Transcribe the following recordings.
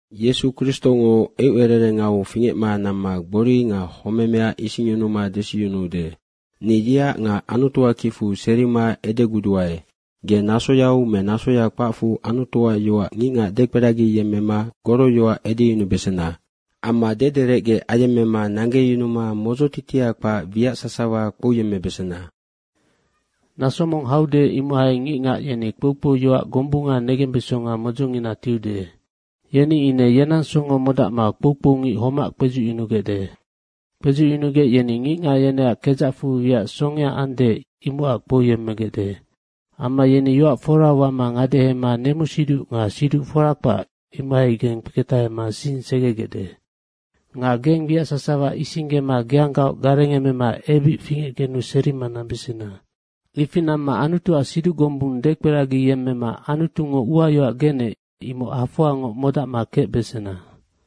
Yesu Kristongo eucererengau fingecma namma gbori nga homemea isingyunuma desiyunuude. Ni yeac nga Anutuac kicfu serima edeguduae, ge nasoyau me nasoya kpacfu Anutuac yoac ngicngac dekperagiyemmema goroyoac edeyunubesena. Amma dederecge ayemmema nanggeyunuma modzotitia kpac wiac sasawa kpouyemmebesena. Naso mong haude, imohai ngicngac yeni kpoukpouyoac gombunga negembesonga modzongina tiude. Yeni ine yenang songo modacma kpoukpoungic homac kpedzucyunugecde. Kpedzucyunugec yeni ngicngac yeneac kedzacfu wiac songea ande, imocac kpouyemmegecde. Amma yeni yoac fora wama ngadehema nemusiduc nga siduc fora kpac, imohaigeng kpeketahema sing segegecde. Nga geng wiac sasawa isinggema geanggaoc garengemema ebic fingecgenu serima nambesena. Ifi namma Anutuac siduc gombung dekperagiyemmema Anutungo uayoac genec, imoc hafoangoc modacma kecbesena.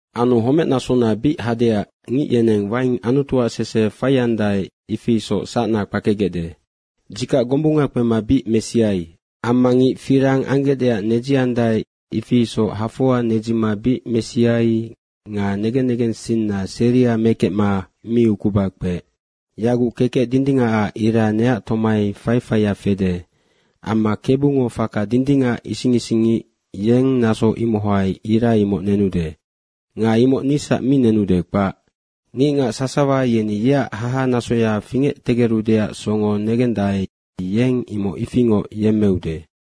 Anu homecnasona bic hadeac ngic yeneng waing Anutuac sese faiandae, ifi isoc sacna kpakegecde. Dzikac gombunga kpema bic mesiai. Amma ngic firang anggecdeac nedziandae, ifi isoc hafoa nedzima bic mesiai nga negen negensinna seria mekecma mi ukuba kpeec. Yaguc kekec dindingacac ira neac tomai faifaia fede. Amma Kebungo faka dindingac ising isingngic, yeng naso imohai ira imoc nenude. Nga imoc nisac mi nenude, kpac. Ngicngac sasawa yeni yeac haha nasoya fingectegerudeac songo negendae, yeng imoc ifingoc yemmeude.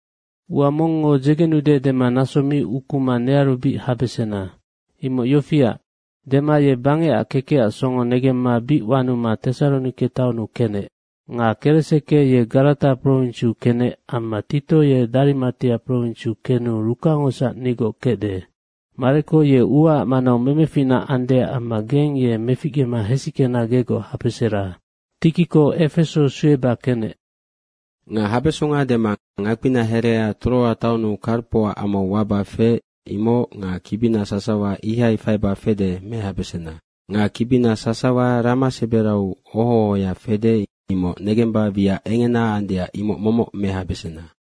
Ua mongngo dzegenude dema naso mi ukuma nearu bic habesena. Imoc yofiac, Dema ye bangecac kekecac songo negemma bic wanuma Tesaronike taonnu kenec. Nga Kereseke ye Garata prowinsiu kenec amma Tito ye Darimatia prowinsiu kenu Rukangosac nigoc kecde. Mareko ye uaac manau memeficna andeac amma geng ye meficgema hesickena gegoc habesera. Tikiko Efeso sueba kenec. Nga habesonga dema ngakpina herea Troa taonnu Karpoac amau waba feec, imoc nga kibina sasawa ihai faiba fede mehabesena. Nga kibina sasawa rama seberau oho ohoya fede, imoc negemba wiac engena andeac imoc momoc mehabesena.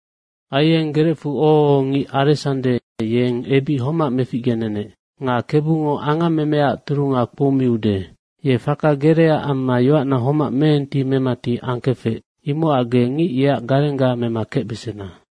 Aieng gerecfu oho ohongic Aresande, yeng ebic homac meficgenenec. Nga Kebungo angammemeaac turunga kpoumiude. Ye faka gerea amma yoacna homac meenti memati angkefec, imocac ge ngic yeac garengga mema kecbesena.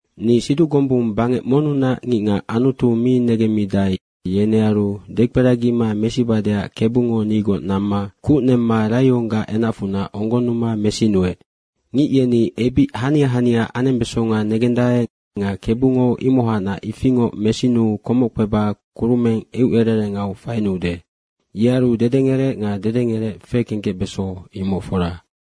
Ni siduc gombung bangec monnunac ngicngac Anutu mi negemmidae, yenearu dekperagima mesibadeac Kebungo nigoc namma kuc nemma raionggac enacfunac onggonnuma mesinuec. Ngic yeni ebic hania hania anembesonga negendae nga Kebungo imohacnac ifingoc mesinuu komoc kpeba kurumeng eucererengau fainuude. Yearu dedengerec nga dedengerec fekengkecbeso, imoc fora.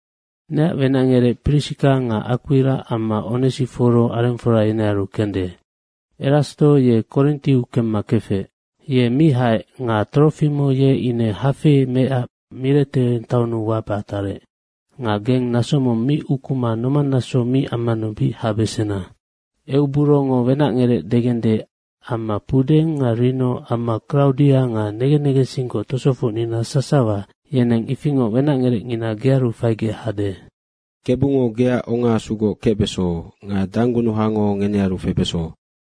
Neac wenacngerec Prisika nga Akpira amma Onesiforo arengfora yenearu kende. Erasto ye Korintiu kemma kefec. Ye mi haec nga Trofimo ye ine hafei meecac Mirete taonnu waba tarec. Nga geng naso mong mi ukuma nomannaso mi ammanu bic habesena. Euburongo wenacngerec degende amma Pudeng nga Rino amma Kraudia nga nengen negensinggoc tosofocnina sasawa, yeneng ifingoc wenacngerecngina gearu faigec hade. Kebungo geac ongaasugoc kecbeso. Nga danggunuhango ngenearu febeso.